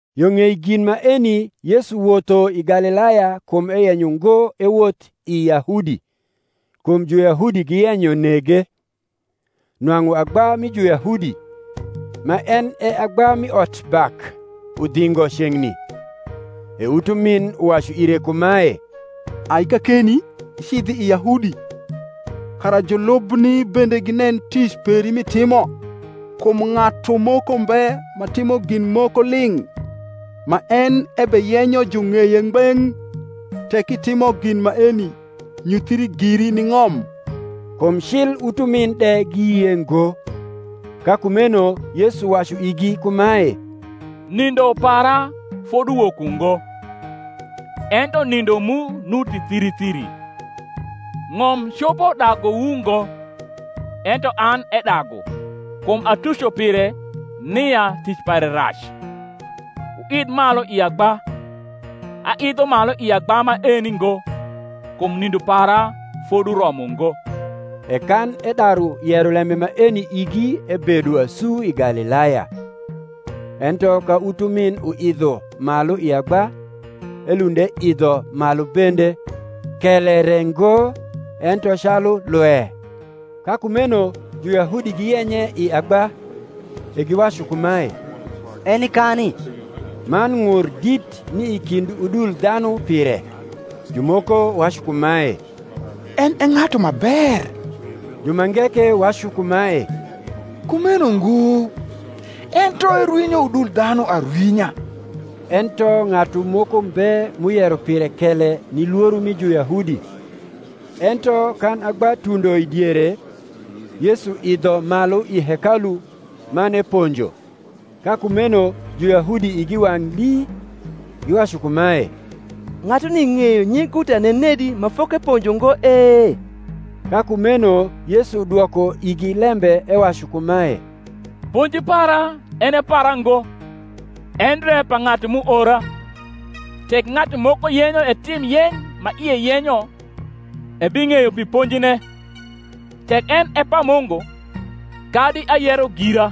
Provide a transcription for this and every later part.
Yo ng’ei gin maeni Yesu wotho i Galilaya kum eyenyo ngo ewoth i Yahudi, kum Juyahudi giyenyo nege. Nwang’u agba mi Juyahudi, ma en e agba mi otbak, udhingo ceng’ni. E utumin uwacu ire kumae, Ai kakeni, icidh i Yahudi, kara julubni bende ginen tic peri m’itimo. Kum ng’atu moko mbe ma rimo gin moko ling’, ma en ebeyenyo jung’eye ngbeng’. Tek itimo gin maeni, nyuthri giri ni ng’om. Kum cil utumin de giyie ngo. Ka kumeno Yesu wacu igi kumae, Nindo para foduwok ungo; ento nindo mu nuti thiri thiri. Ng’om copo daguwu ngo; ento an edagu, kum atuco pire, nia tic pare rac. Wuidh malu i agba: aidho malu i agba maeni ngo, kum nindo para foduromo ngo. E kan edaru yero lembe maeni igi ebedo asu i Gahiaya. Ento ka utumin uidho malu i agba, elund eidho malu bende, kele re ngo, ento calu lwe. Ka kumeno Juyahudi giyenye i agba, e giwacu kumae, Eni kani? Man ng’ur dit ni i kind udul dhanu pire: jumoko wacu kumae, En e ng’atu ma ber: jumange ke wacu kumae, Kumeno ngo, ento erwinyo udul dhanu arwinya. Ento ng’atu moko mbe m’uyero pire kele ni lworo mi Juyahudi. Ento kan agba tundo i diere Yesu idho malu i hekalu, man eponjo. Ka kumeno Juyahudi igi wang’ lii, giwacu kumae, Ng’atuni ng’eyo nyiguta nenedi ma fokeponjo ngo e? Ka kumeno Yesu dwoko igi lembe ewacu kumae, Ponji para en e para ngo, endre pa ng’atu m’uora. Tek ng’atu moko yenyo etim yeny ma ie yenyo, ebing’eyo pi ponjine, tek en e pa Mungu, kadi ayero gira.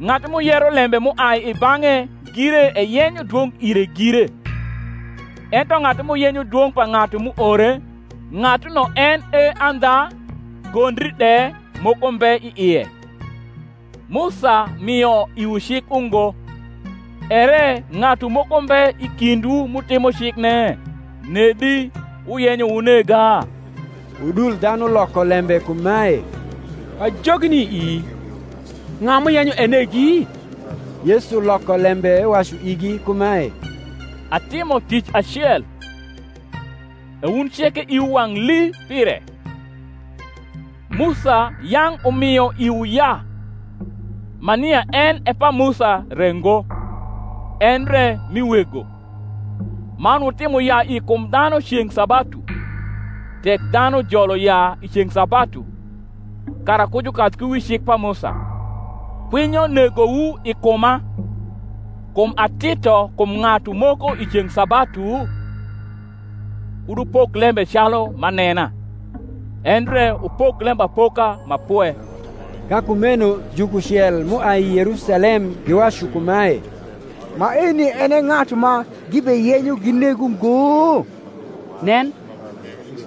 Ng’atu m’uyero lembe m’uai i bang’e gire eyenyo dwong’ ire gire: ento ng’atu m’uyenyo dwong’ pa ng’atu m’uore, ng’atuno en e andha, gondri de moko mbe i ie. Musa mio iwu cik ungo, ere ng’atu moko mbe i kindwu m’utimo cikne? Nedi wuyenyo wunega? Udul dhanu loko lembe kumae, Pajogi ni ii: ng’a m’uyenyo enegi? Yesu loko lembe ewacu igi kumae, Atimo tic acel, e wun ceke iwu wang’ lii pire. Musa yang’ umio iwu yaa (ma nia en e pa Musa re ngo, endre mi wego); man wutimo yaa i kum dhanu ceng’ sabatu. Tek dhanu jolo yaa i ceng’ sabatu, kara ku jukadh ku wi cik pa Musa; kwinyo negowu i kuma, kum atito kum ng’atu moko i ceng’ sabatu? Kud wupok lembe calu m’anena, endre wupok lembapoka ma pwe. Ka kumeno jukucel m’uai Yerusalem giwacu kumae, maeni en e ng’atu ma gibeyenyo gineg ungo? Nen,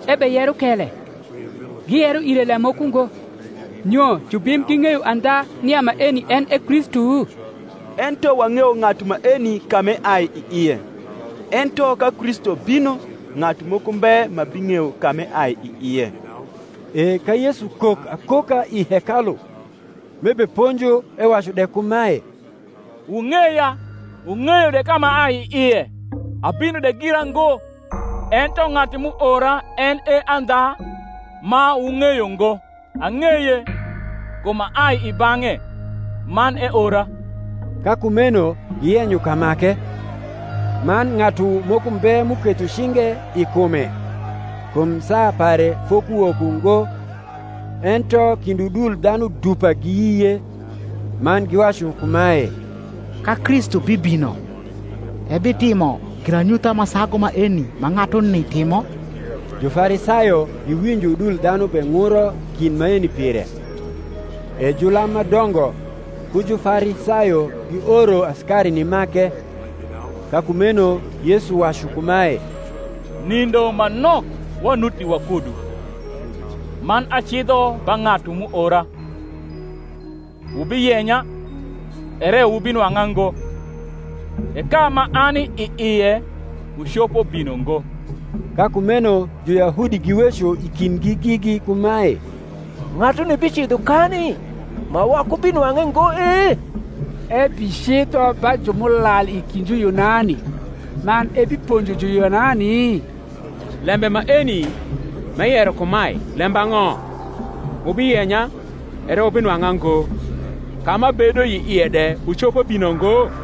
ebeyero kele, giyero ire lem moko ngo. Nyo jubim ging’eyo andha nia maeni en e Kristu? Ento wang’eyo ng’atu maeni ka m’eai i ie: ento ka Kristu bino, ng’atu moko mbe ma bing’eyo ka m’eai i ie. E ka Yesu kok akoka i hekalu, m’ebeponjo ewacu de kumae, Wung’eya, wung’eyo de ka m’aai i ie; abino de gira ngo, ento ng’atu m’uora en e andha, ma wung’eyo ngo. Ang’eye, kum aai i bang’e, man eora. Ka kumeno giyenyo kamake: man ng’atu moko mbe m’uketho cinge i kume, kum saa pare fokuwok ungo. Ento kind udul dhanu dupa giyie; man giwacu kumae, Ka Kristu bibino, ebitimo giranyutha ma sagu maeni ma ng’atuni timo? Jufarisayo giwinjo udul dhanu beng’uro gin maeni pire: e julam ma dongo ku Jufarisayo gioro asikari nimake. Ka kumeno Yesu wacu kumae, Nindo ma nok wanuti wakudu, man acidho ba ng’atu m’uora. Wubiyenya, ere wubinwang’a ngo: e ka ma ani i ie, wucopo bino ngo. Ka kumeno Juyahudi giweco i kindgi gigi kumae, Ng’atuni bicidho kani ma wakubinwang’e ngo e? ebicidho ba ju m’ulal i kind Juyunani, man ebiponjo Juyunani? Lembe maeni m’eyero kumae lembang’o, Wubiyenya, ere wubinwang’a ngo; ka m’abedo i ie de wucopo bino ngo?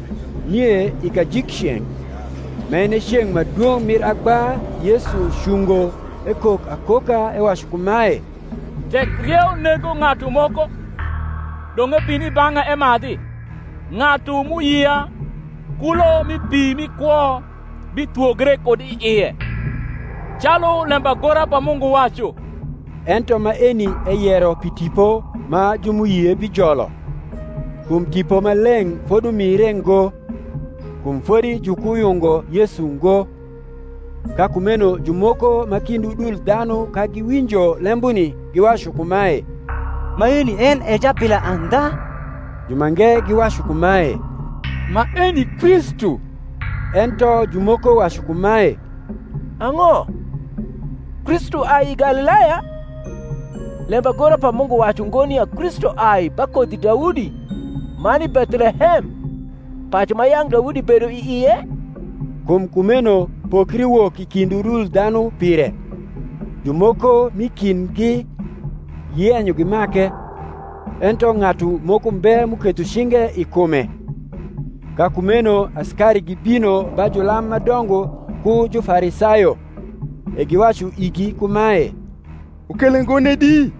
Nie i kajikceng’, ma en e ceng’ ma dwong’ mir agba Yesu cungo ekok akoka, ewacu kumae, Tek rieu nego ng’atu moko, dong’ ebin i bang’a emadhi. Ng’atu m’uyia, kulo mi pi mi kwo bithwogre kud i ie, calu lembagora pa Mungu wacu. Ento maeni eyero pi Tipo ma ju m’uyie bijolo: kum Tipo Maleng’ fodumire ngo; kum fodi jukuyungo Yesu ngo. Ka kumeno jumoko ma kind udul dhanu ka giwinjo lembuni giwacu kumae, Maeni en e jabila andha. Jumange giwacu kumae, Maeni Kristu. Ento jumoko wacu kumae, Ang’o, Kristu ai i Galilaya? Lembagora pa Mungu wacu ngo nia Kristu ai ba kodhi Daudi, man i Bethlehem, pacu ma yang’ Daudi bedo i ie? Kum kumeno pokri wok i kind udul dhanu pire. Jumoko m’i kindgi giyenyo gimake; ento ng’atu moko mbe m’uketho cinge i kume. Ka kumeno asikari gibino ba julam ma dongo ku Jufarisayo; e giwacu igi kumae, Wukele ngo nedi?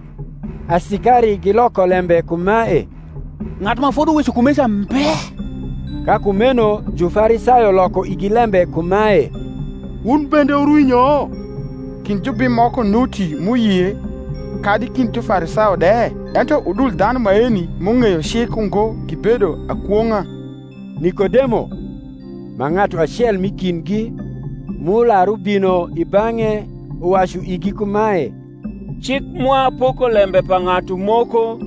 Asikari giloko lembe kumae, Ng’atu ma foduweco kumeca mbe. Ka kumeno Jufarisayo loko igi lembe kumae, Wun bende wurwinyo? Kind jubim moko nuti m’uyie, kadi kind Jufarisayo de? Ento udul dhanu maeni m’ung’eyo cik ungo gibedo akwong’a. Nikodemo (ma ng’atu acel m’i kindgi, m’ular ubino i bang’e), uwacu igi kumae, Cik mwa poko lembe pa ng’atu moko,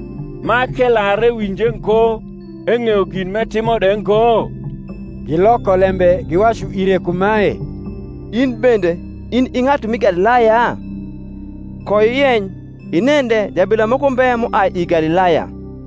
ma k’elar ewinje ngo, eng’eyo gin m’etimo de ngo? Giloko lembe giwacu ire kumae, In bende in i ng’atu m’i Galilaya? Koiyeny, inen de jabila moko mbe m’uai i Galilaya.